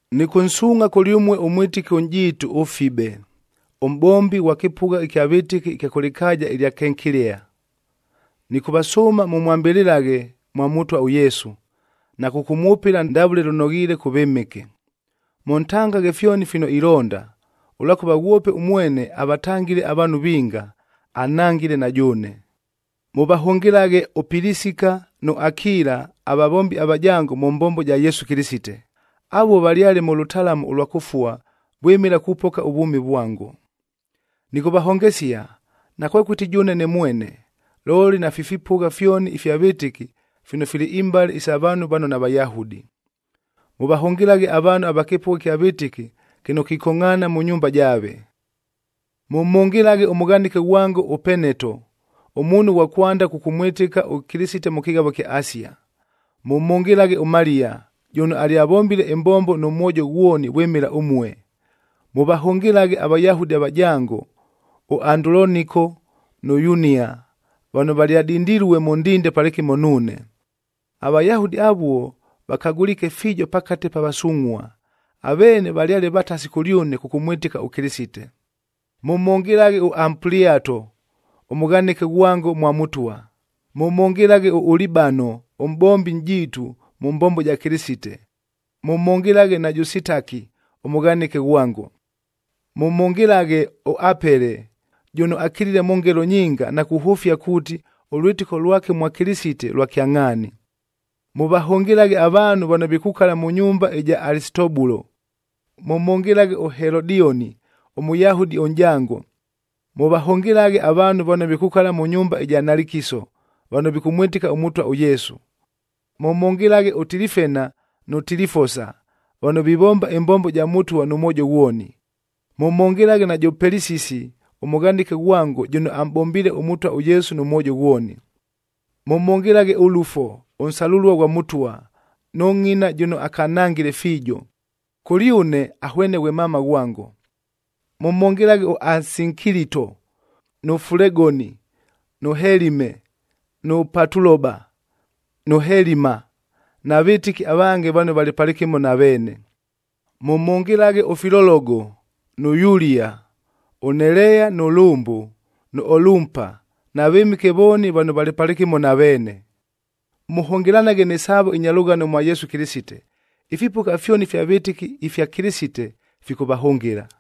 Nɨkʉnsuungʼha kʉlyʉmue ʉmwɨtɨki ʉnʼjiitu ʉFibe, ʉmʼbombi ghwa kɨpʉgha ɨkya vɨtɨki ɨkya kʉ lɨkaaja ɨlya Kenkilea. Nɨkʉvasʉʉma mʉmwambɨlɨlaghe mwa Mʉtwa ʉYesu, na kʉkʉmwʉpɨla ndavʉle lʉnoghiile kʉ vɨmɨke. Mʉntangaghe fyoni fino ilonda, ʉlwakʉva ghwope ʉmwene avatangile avaanhu vinga, anhangile na jʉʉne. Mʉvahʉngɨlaghe ʉPilisika nʉ Akila avavombi avajango mʉ mbombo ja Yesu Kɨlɨsite. Avuo valyale mʉ lʉtalamu ʉlwa kʉfua vwɨmɨla kupoka ʉvwʉmi vwango. Nɨkʉvahongesia, nakwekʉti jʉʉne ne mwene, looli nafi fipʉgha fyoni ifya vɨtɨki fino fili imbale sa vaanhu vano naVayahudi. Mʉvahʉngɨlaghe avaanhu va kɨpʉgha ɨkya vɨtɨki kɨno kikongʼhaana mʉ nyumba jaave. Mʉmhʉngɨlaghe ʉmʉghanɨke ghwango ʉEpeneto, ʉmuunhu ghwa kwanda kʉkʉmwɨtɨka ʉKɨlɨsite mʉ kɨghavo kya Asia. Mʉmhʉngɨlaghe ʉMaliya, jʉno alyavombile ɨmbombo nʉ mwojo ghwoni vwɨmɨla ʉmue. Mʉvahʉngɨlaghe aVayahudi avajango ʉAnduloniko nʉ Yunia vano valyadindilue mʉ ndinde palɨkɨmo nuune. AVayahudi avuo vakagʉliike fiijo pakate pa vasungʼhua,a aveene valyale vatasi kʉlyʉne kʉkʉmwɨtɨka ʉKɨlɨsite. Mʉmhʉngɨlaghe ʉAmpuliato, ʉmʉghanɨke ghwango mwa Mʉtwa. Mʉmhʉngɨlaghe ʉUlibano ʉmʼbombi nʼjiitu mʉ mbombo ja Kɨlɨsite, mʉmhʉngɨlaghe najʉ Sitaki ʉmʉghanɨke ghwango. Mʉmhʉngɨlaghe ʉApele, jʉno akiliile mʉ ngelo nyinga na kuhʉfia kuuti, ʉlwɨtɨko lwake mwa Kɨlɨsite lwa kyangʼhaani. Mʉvahʉngɨlaghe avaanhu vano vikukala mʉ nyumba ɨja Alisitobulo. Mʉmhʉngɨlaghe ʉHelodioni, ʉMʉyahudi ʉnʼjango. Mʉvahʉngɨlaghe avaanhu vano vikukala mʉ nyumba ja Nalikiso, vano vikʉmwɨtɨka ʉMʉtwa ʉYesu. Mʉmhʉngɨlaghe ʉTilifena nʉ Tilifosa, vano vivomba ɨmbombo ja Mʉtwa nʉ mwojo ghwoni. Mʉmhʉngɨlaghe najʉ Pelisisi ʉmʉghanɨke ghwango jʉno amʼbombiile ʉMʉtwa ʉYesu nʉ mwojo ghwoni. Mʉmhʉngɨlaghe ʉLufo, ʉnsalʉlua ghwa Mʉtwa, nʉ ngʼina jʉno akanhangile fiijo. Kʉlyʉne ahwene ghwe mama ghwango. Mʉmhʉngɨlaghe ʉAsinkilito, nʉ Fulegoni, nʉ Helime, nʉ Patuloba, nʉ Helima na vɨtɨki avange vano valɨ palɨkɨmo na veene. Mʉmhʉngɨlaghe ʉFilologo, nʉ Yulia, ʉNeleya nʉ lʉmbʉ, nʉ Olumpa, na vɨmɨke vooni vano valɨ palɨkɨmo na veene. Mʉhʉngɨlanaghe nɨ saavo ɨnya lʉghano mwa Yesu Kɨlɨsite. Ifipʉgha fyoni ifya vɨtɨki ifya Kɨlɨsite fikʉvahʉngɨla.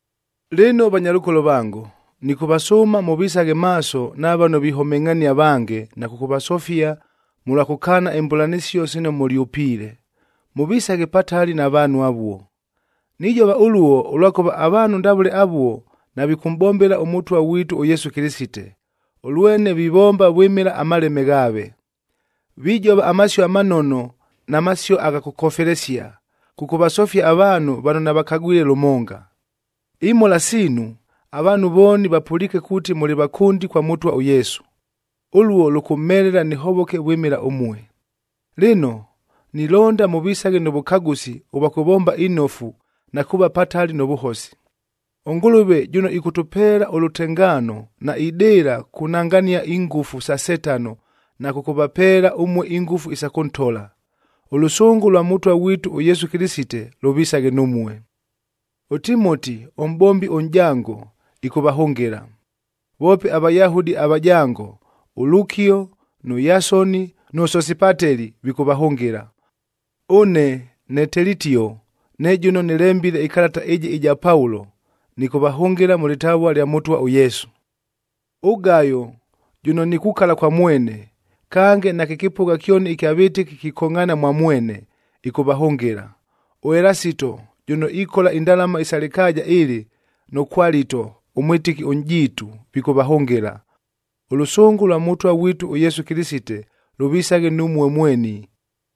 Lɨno vanyalʉkolo vango, nɨkʉvasʉʉma mʉvisaghe maaso na vano vihomengʼhania avange na kʉkʉvasofia mʉlwa kʉkaana imbʉlanɨsio sino mʉlyʉpiile. Mʉvisaghe patali na vaanhu avuo. Nijova ʉluo, ʉlwakʉva avaanhu ndavʉle avuo navikʉmʼbombela ʉMʉtwa ghwitu ʉYesu Kɨlɨsite, ʉlwene vivomba vwɨmɨla amaleme ghaave. Vijova amasio amanono na masio agha kʉkofelesia, kʉkʉvasofia avaanhu vano navakagwile lʉmonga. Imhola siinu, avaanhu vooni vapʉliike kuuti mʉlɨ vakʉndi kwa Mʉtwa ʉYesu. Ʉluo lʉkʉmhelela nɨhovoke vwɨmɨla ʉmue. Lɨno, nilonda mʉvisaghe nʉ vʉkagʉsi ʉvwa kʉvomba inofu na kuuva patali nʉ vʉhosi. ɄNgʉlʉve jʉno ɨkʉtʉpeela ʉlʉtengaano naidɨɨla kunangania ingʉfu sa Setano na kʉkʉvapeela ʉmue ingʉfu isa kʉntola. Ʉlʉsʉngʉ lwa Mʉtwa ghwitu ʉYesu Kɨlɨsite lʉvisaghe numue. ɄTimoti ʉmʼbombi ʉnʼjango, ɨkʉvahʉngɨla. Voope aVayahudi avajango ʉLukio, nʉ Yasoni, nʉ Sosipateli, vikʉvahʉngɨla. Ʉne ne Telitio, ne jʉno nɨlembile ɨkalata ɨjɨ ɨja Paulo, nɨkʉvahʉngɨla mʉ lɨtavua lya Mʉtwa ʉYesu. ɄGayo jʉno nikukala kwa mwene, kange nakɨ kɨpʉgha kyoni ɨkya vɨtɨki kikongʼhaana mwa mwene, ɨkʉvahʉngɨla. ɄElasito jʉno ikola indalama isa lɨkaaja ɨlɨb nʉ Kwalito ʉmwɨtɨki ʉnʼjiitu, vikʉvahʉngɨla. Ʉlʉsʉngʉ lwa Mʉtwa ghwitu ʉYesu Kɨlɨsite lʉvisaghe numue mweni.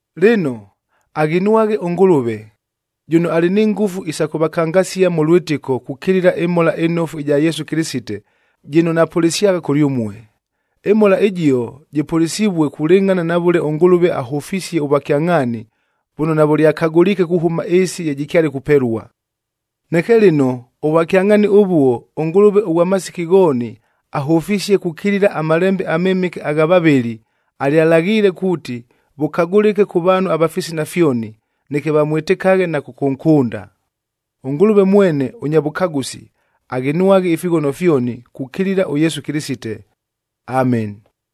Lɨno, aghinwaghe ʉNgʉlʉve, jʉno alɨ ni ngʉfu isa kʉvakangasia mʉ lwɨtɨko kukilila ɨMhola ɨNofu ɨja Yesu Kɨlɨsite jɨno napʉlɨsyagha kʉlyʉmue. ƗMhola ɨjio jɨpʉlɨsivue kulɨngʼhana na vʉle ʉNgʉlʉve ahʉfisie ʉvwakyangʼhaani vʉno navʉlyakagʉliike kuhʉma ɨɨsi ye jɨkyale kupelua. Neke lɨno ʉvwakyangʼhaani ʉvuo, ʉNgʉlʉve ʉghwa masiki ghooni ahʉfisie kukilila aMalembe aMɨmɨke agha vavɨli, alyalaghiile kuuti vʉkagʉlɨke kʉ vaanhu ava fisina fyoni, neke vamwɨtɨkaghe na kʉkʉnkʉnda. ɄNgʉlʉve mwene ʉnya vʉkagʉsi, aghinwaghe ifighono fyoni kukilila ʉYesu Kɨlɨsite! Ameni.